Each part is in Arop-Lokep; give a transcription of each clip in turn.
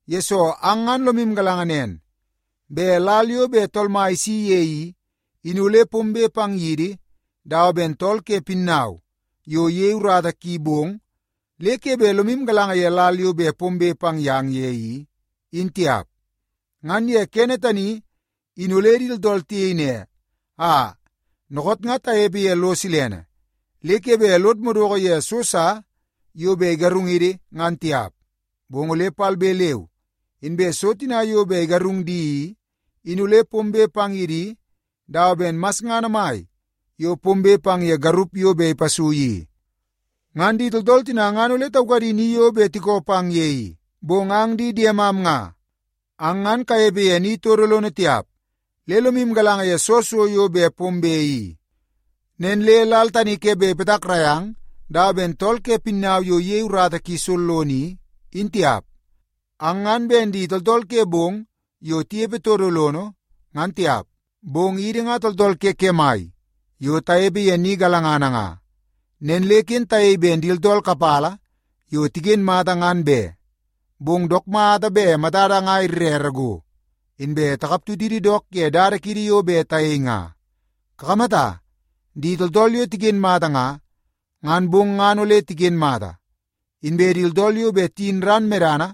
Yesoo, ang ngan lomu galanga nen bet lal yo bet Tool Mai isi ye i, in ole pombe pang yidi dawa ben tool ke pinnau yo iyei urata ki bong, le ke bet lomu galanga ye lal yo bet pombe pang yang ye i, in tiap. Ngan ye kene tani, in ole di tooltool tiyei ne, “Aa, dookoot nga tanepe ye lo silene, le ke bet lod madoko ye so sa yo bet igarungidi ngan tiap.” Bong ole palbe leu inbe so tina yo bet igarung di i, in ole pombe pang ye di dawa ben masngana mai yo pombe pang ye garup yo bet ipasui i. Ngan di tooltool tina ngan ole taukadi ni yo bet tikoo pang ye i. Bong ang di diemam nga, ang ngan kanepe ye ni todo lono tiap le lomu galanga ye soo so yo bet pombe i. Nen le lal tani ke bet ipatakrai ang dawa ben tool ke pinnau yo iyei urata ki sollono i, in tiap. Ang ngan ben di tooltool ke bong yo tinepe todo lono ngan tiap, bong idi nga tooltool ke kemai yo tanepe ye ni galangana nga. Nen le ken tayei ben di tooltool kapala yo tiken mata ngan be, bong dook mata bet matada nga irere go, inbe takap tutidi dook ye dada kiidi yo bet tayei nga. Kakamata, di tooltool yo tiken mata nga, ngan bong ngan ole tiken mata. Inbe di tooltool yo bet tiyin ran medana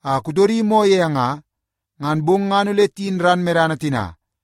a kutodi moo ye nga, ngan bong ngan ole tiyin ran medana tina.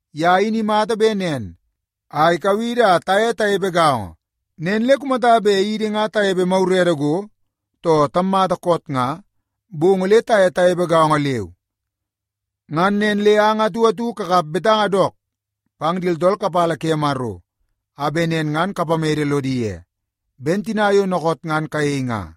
Ye in imata bet nen a ikau idi a taye tanepe gaongo. Nen le kumata bet idi nga tanepe magurede go, too tammata koot nga, bong ole taye tanepe gaongo leu. Ngan nen le ang atu atu kakap betanga dook pang di tooltool kapala ke Maro a bet nen ngan kapamede lodi ye, ben tina yo dookoot ngan kayei nga.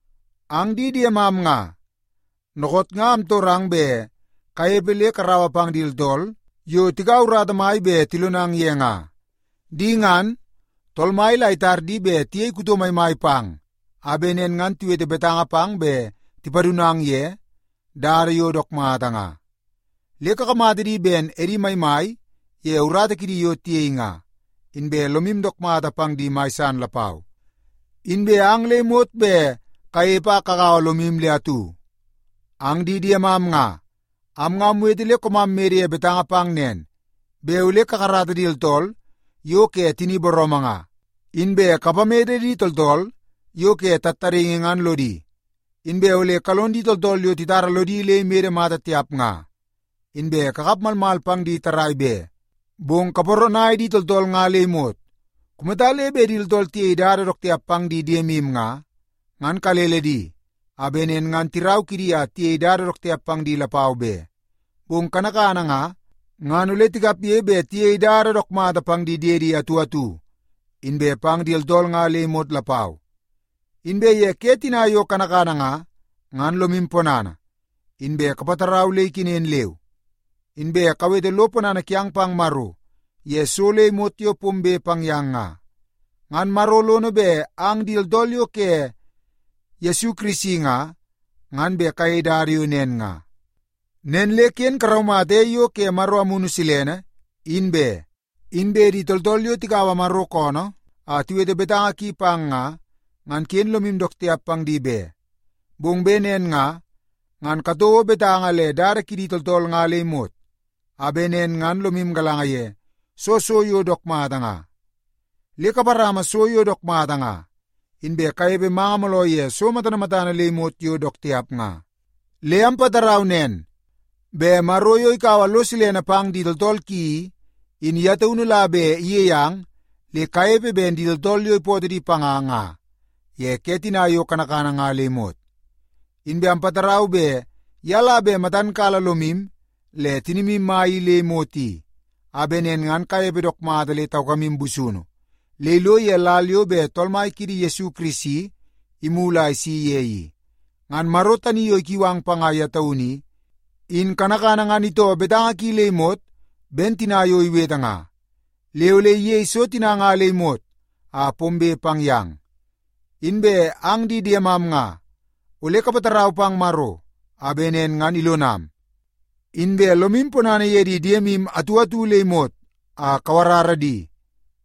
Ang di diemam nga, dookoot nga amtorang bet kanepe le karaua pang di tooltool yo tikaua urata mai bet tilonang ye nga. Di ngan, Tool Mai la itar di bet tiyei kuto maimai pang a bet nen ngan tiwete betanga pang bet tipadunang ye dada yo dook mata nga. Le kakamata di ben edi maimai ye urata kidi yo tiyei nga, inbe lomu dook mata pang di mai san lapau. Inbe ang le imot bet kanepe a kagaua lomu le atu. Ang di diemam nga, am nga amwete le koomam mede ye betanga pang nen, bet ole kakarata di tooltool yo ke tini booroomoo nga, inbe kapamede di tooltool yo ke tattadaingi ngan lodi. Inbe ole kalon di tooltool yo titara lodi le imede mata tiap nga, inbe kakap malmal pang di tarrai be, bong kaparanai di tooltool nga le imot. Kumata le bet di tooltool tiyei dada dook tiap pang di diemu nga, ngan kalele di a bet nen ngan tirau kidi a tiyei dada dook tiap pang di lapau be. Bong kanakana nga, ngan ole tikapge bet tiyei dada dook mata pang di diedi atu atu, inbe pang di tooltool nga le imot lapau. Inbe ye ke tina yo kanakana nga, ngan lomu ponana, inbe kapatarau le ikenen leu. Inbe kawete lo ponana kiang pang Maro ye so le imot yo pombe pang yang nga. Ngan Maro lono bet ang di tooltool yo ke Yesu Kirisi nga, ngan bet kayei dada yo nen nga. Nen le ken karaumata ei yo ke Maro Amunu Silene in be. Inbe di tooltool yo tikaua Maro koonoo a tiwete betanga ki pang nga, ngan ken lomu dook tiap pang di be. Bong bet nen nga, ngan katouo betanga le dada kidi tooltool nga le imot, a bet nen ngan lomu galanga ye soo so yo dook mata nga. Le kaparama so yo dook mata nga, inbe kanepe manga mooloo ye so matana matana le imot yo dook tiap nga. Le ampatarau nen, bet Maro yo ikaua lo silene pang di tooltool ki i, in ye taunu la bet iyei ang le kanepe ben di tooltool yo ipootoo di panga nga ye ke tina yo kanakana nga le imot. Inbe ampatarau bet ye la bet matan kala lomu le tinimu mai i le imot i, a bet nen ngan kanepe dook mata le taukamu busunu le ilo ye lal yo bet Tool Mai kiidi Yesu Kirisi imulu a isi ye i. Ngan Maro tani yo ikiu ang panga ye taunu i, in kanakana ngan itoo betanga ki le imot ben tina yo iwete nga. Le ole iyei so tina nga le imot a pombe pang yang. Inbe ang di diemam nga, ole kapatarau pang Maro a bet nen ngan ilonam. Inbe lomu ponana ye di diemu atu atu le imot a kawarara di,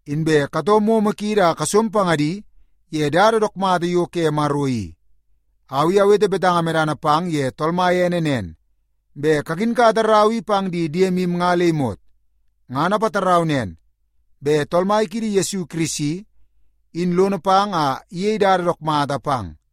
inbe katoo momo kiidi a kasom pangadi ye dada dook mata yo ke Maro i. Au i awete betanga medana pang ye Tool Mai ene nen, bet kakinkata rau i pang di diemu nga le imot. Ngan apatarau nen, bet Tool Mai kiidi Yesu Kirisi, in lono pang a iyei dada dook mata pang.